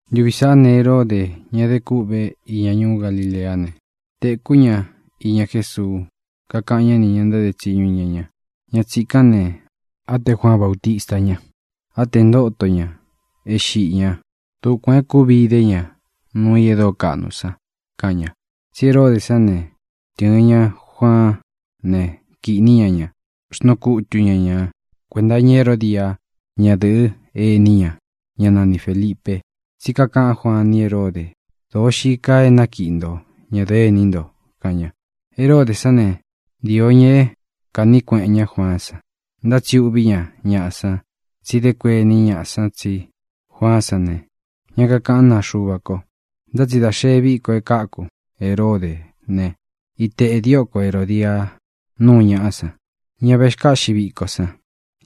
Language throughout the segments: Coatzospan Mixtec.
Ntuvi sāꞌá ne, Heródē, ña é de kuꞌvé iña ñuú Galileá ne, tēkú ña iña Jésuu. Kakaꞌan ñá nī ña ntáde tsiñu iña ña: —Ña tsīkán ne, á tē Juaan Bautista ña. Á tē ntóto ñā e xiꞌi ña. Dukuān é kūvi ide ña nuu i e dóo kaꞌnu san —kaꞌan ña. Tsí Heródē sán ne, tɨ̄ɨn ña Juaán ne, kīꞌní ña ña ne, xnuu kutu ña ñā kuenta iña Heródia, ñadɨ̄ꞌɨ́ ení ña, ñá nani Fēlipe. Tsí kakaꞌán Juaan ni Heródē: —Dōo xii kaa é nakiꞌi nto ñadɨ̄ꞌɨ́ ení nto —kaꞌan ña. Heródē sán ne, ntīo ña é kāꞌní kueꞌen ñá Juaán san, ntá tsi uꞌví ña ñaꞌa san, tsi dé kuení ñaꞌa san tsí Juaán san ne, ña kakaꞌán naa Xuva ko. Ntá tsi dā xee víko é kāku Heródē ne, ítēꞌe dióko Herōdia nuu ñaꞌá san, ña vexkáꞌxi viko san.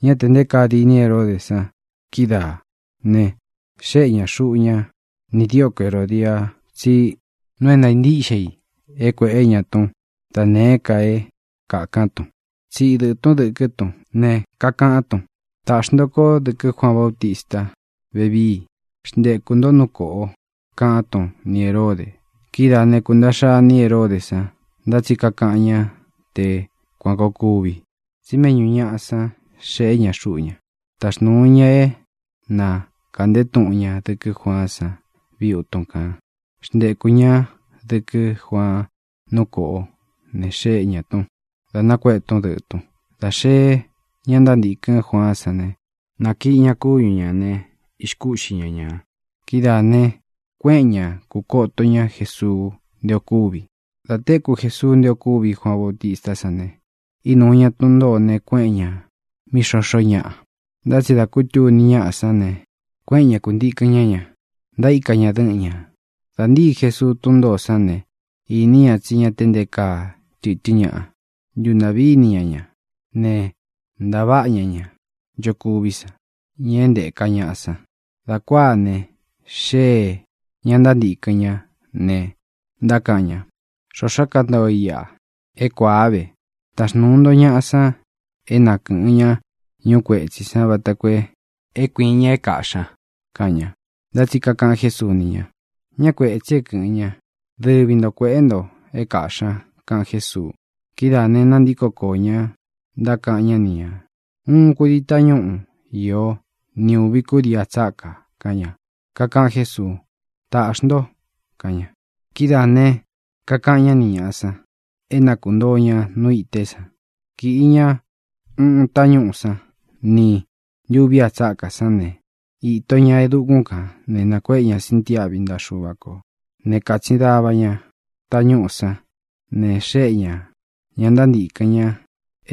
Ñá tē nté kaa dīní Heródē san kídaā ne, xéꞌe ña xuꞌu ña nī dioko Herodia tsí nuu é ntāa ntíꞌxe i é kuēꞌé ña tún da nēé ka é kākán tun. Tsiꞌi dɨꞌɨ̄ tún dɨkɨ́ tun nēe é kākán tun ne, kakaꞌán tun: —Tāꞌxi nto kó dɨkɨ́ Juaan Bautista vevíi. Xntekū nto nú kōꞌo —kaꞌán tun ni Hērode. Kidáā né, kūntaꞌxa iní rei Heródē san. Ntá tsi kakaꞌan ñá te kuan kōo kuvi, tsí méꞌñū ñaꞌá san xeꞌé ña xuꞌu ña. Taxnūu ña é na kāꞌnté tuꞌun ña dɨkɨ́ Juaán san viutun kān. Xntekū ñá dɨkɨ́ Juaan nú kōꞌo ne, xéꞌe ñā tún, dā nakuéꞌē tún dɨꞌɨ̄ tun. Dā xeé ña ntántīkɨ́n Juaán san ne, nākiꞌi ña kúñu ñā ne, ixkúꞌxi ña ñā. Kidáā ne, kuéꞌen ña kūkoto ñá Jēsuu nté ō kúvi. Dā téku Jesuu nté ō kúvi Juaan Bautistá san ne, ínuu ña tun ntōó ne, kuéꞌen ñā mí xoxó ñaꞌa. Ntá tsi dā kútuni ñáꞌa sán ne, kuéꞌen ña kūntikɨn ñá ña. Ntaíka ña dɨ́ꞌɨn ñā. Dā ntíi Jesuu tún ntōó san ne, īní ña tsí ña te nté kaa tɨtɨ́n ñaꞌa. Ntúntāꞌví ini ña ña ne, ntaváꞌa ña ña nchokuví san, ña é ntēka ñaꞌa san. Dā kuáa ne, xéē ña ntántīkɨn ñá ne, ntákaꞌan ña: —Xoxó kantoo i iꞌa. É kuāá ve. Taxnūu nto ñaꞌa san é na kɨ̄ꞌɨn ña ñúu kuetsī san vata koo é kuīin ña é kāꞌxí ña —kaꞌan ña. Ntá tsi kakaꞌan Jésuu ni ña: —Ñá kuētsi é kɨ̄ꞌɨn ña. Dɨvi nto kuēꞌé xnto é kāꞌxí ña —kaꞌan Jésuu. Kidáā ne, nantíko koō ña, ntákaꞌan ñá ni ñā: —Úꞌun kūdii tañúꞌu īó ni ūvi kudii a tsákā —kaꞌan ña. Kakaꞌan Jésuu: —Tāꞌxi nto —kaꞌan ña. Kidáā ne, kakaꞌan ñá ni ñāꞌa san é na kuntōo ña nu ité sān. Kīꞌi ña uꞌun tañúꞌū sán ni ntūvi a tsákā sán ne, īto ña e dukún kān ne, nākuéꞌe ña sintiáꞌvi ntaꞌa Xuva kō né, kātsin dava ña tañúꞌū sán ne, xéꞌe ñā ña ntántīkɨn ña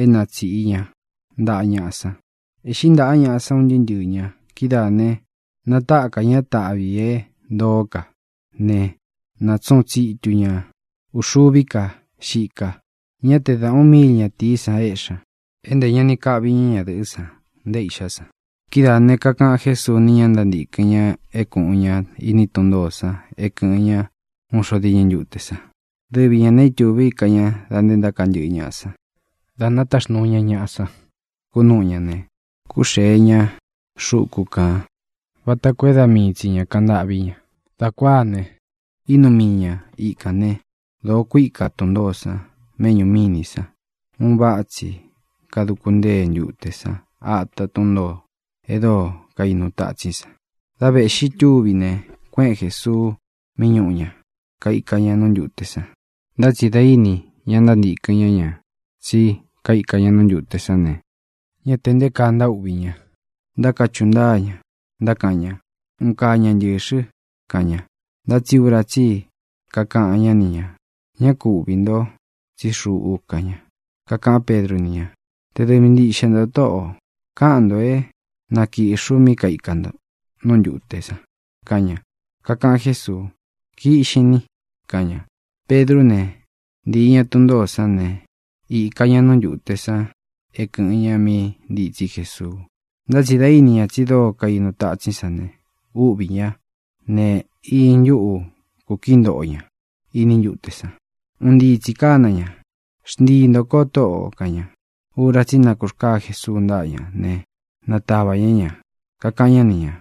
é na tsīꞌi ña ntaꞌa ñaꞌa san. Ēꞌxí ntaꞌa ñaꞌa san, un ntɨɨ́ ntɨɨ̄ ña. Kidáā ne, natákā ñá taꞌvi ī é ntoó ka ne, natsuꞌun tsitu ña ūxuví ka xika. Ñá te da ūꞌun míil ñatīí san éꞌxi ña. É ntē ña ni kaꞌvi ña ñadɨꞌɨ́ san, nté īꞌxá san. Kidáā ne, kakaꞌan Jésuu ni ña ntántīkɨn ña é kūꞌun ña iní tun ntōó san e kɨ́ꞌɨn ña uun xo diñɨ ntute san. Dɨvi ñā ne, ítūví ka ña da nté ntaka ntɨꞌɨ ñaꞌa san. Dā nátaxnūu ña ñaꞌa san kunúꞌu ñā ne, kúxee ña xuku kān vata koo é da mii tsi ñā kaꞌan ntâꞌví ña. Dā kuáa ne, ínuu mii ña ikān né, dōo kuíka tun ntōó san méꞌñū mínī san. Un váꞌa tsi kanaduku ntúte san ata tún ntōó e dóo kainu tatsín san. Dá vēꞌxi túvi ne, kuéꞌen Jēsuu mí ñūꞌu ña, kaika ña nú ntūte san. Ntá tsi dā íni ña ntántīkɨn ñá ña tsí kaika ña nú ntūte sán ne, ñá tē nté kaa ntaúꞌvī ña. Ntákachuꞌu ntáa ña, ntákaꞌan ña: —¡Un kaa ña ntɨ̄xɨ! —kaꞌan ña. Ntá tsi ura tsí i kakaꞌan ñá ni ñā: —¡Ñá ku uꞌvī nto, tsí xuꞌu! —kaꞌan ña. Kakaꞌán Pedru ni ña: —Te dɨvi ntiꞌxe ntō, Tóꞌō, káꞌan ntō é na kīꞌxi u mí kaika nto nú ntūte san —kaꞌan ña. Kakaꞌan Jésuu: —Kiꞌxin ni —kaꞌan ña. Pedrú ne, ntīi ña tún ntōó san ne, īka ña nú ntūte san é kɨ̄ꞌɨn ña mí ntitsí Jesuu. Ntá tsi dā íni ña tsi dóo kainu tatsín san ne, úꞌvī ñá ne, iñɨ ntuꞌu kūkií ntoꞌo ña iní ntute san. Un ntíi tsī kána ña: —¡Xntii ntō ko, Tóꞌō! —kaꞌan ña. Ura tsí i nakurkáa Jesuu ntáꞌa ña ne, nātava ña ña. Kakaꞌan ñá ni ñā: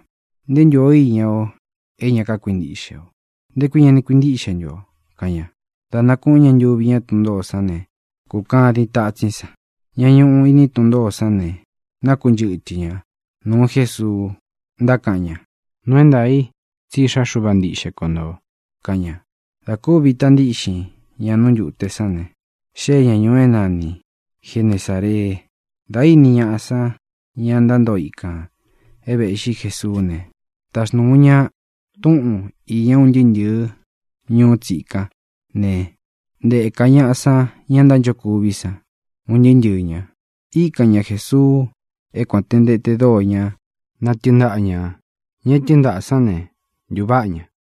—¡Nté ō ntú iña o é ña kákuintiꞌxe o! ¿Nté kui ña ni kuintíꞌxe ntu o? —kaꞌan ña. Dā nakúꞌun ña ntuvi ñá tun ntōó san ne, kūkadin tatsín san. Ñá ñuꞌu iní tun ntōó san ne, nákunchɨtɨ ña nūu Jésuu, ntákaꞌan ña: —¡Nuu é ntaā i tsí Iꞌxá Xuva ntiꞌxe ko ntō! —kaꞌan ña. Dā kúvi ita ntíꞌxin ña ntute sán ne, xée ña ñūu é nani Genesāree. Dā íni ñaꞌa san, ña ntántoo ikān, e véꞌxi Jesuú ne, taxnūu ña túꞌun īña un ntɨɨ́ ntɨ̄ɨ́ ñuú tsikán ne, ntēka ñaꞌa san ña ntánchokuví san, un ntɨɨ́ ntɨɨ̄ ña. Īkan ña Jesuu é kuān te ntete dóo ña na tɨɨn ntáꞌa ñā. Ña é tɨɨn ntaꞌā sán ne, ntūváꞌa ña.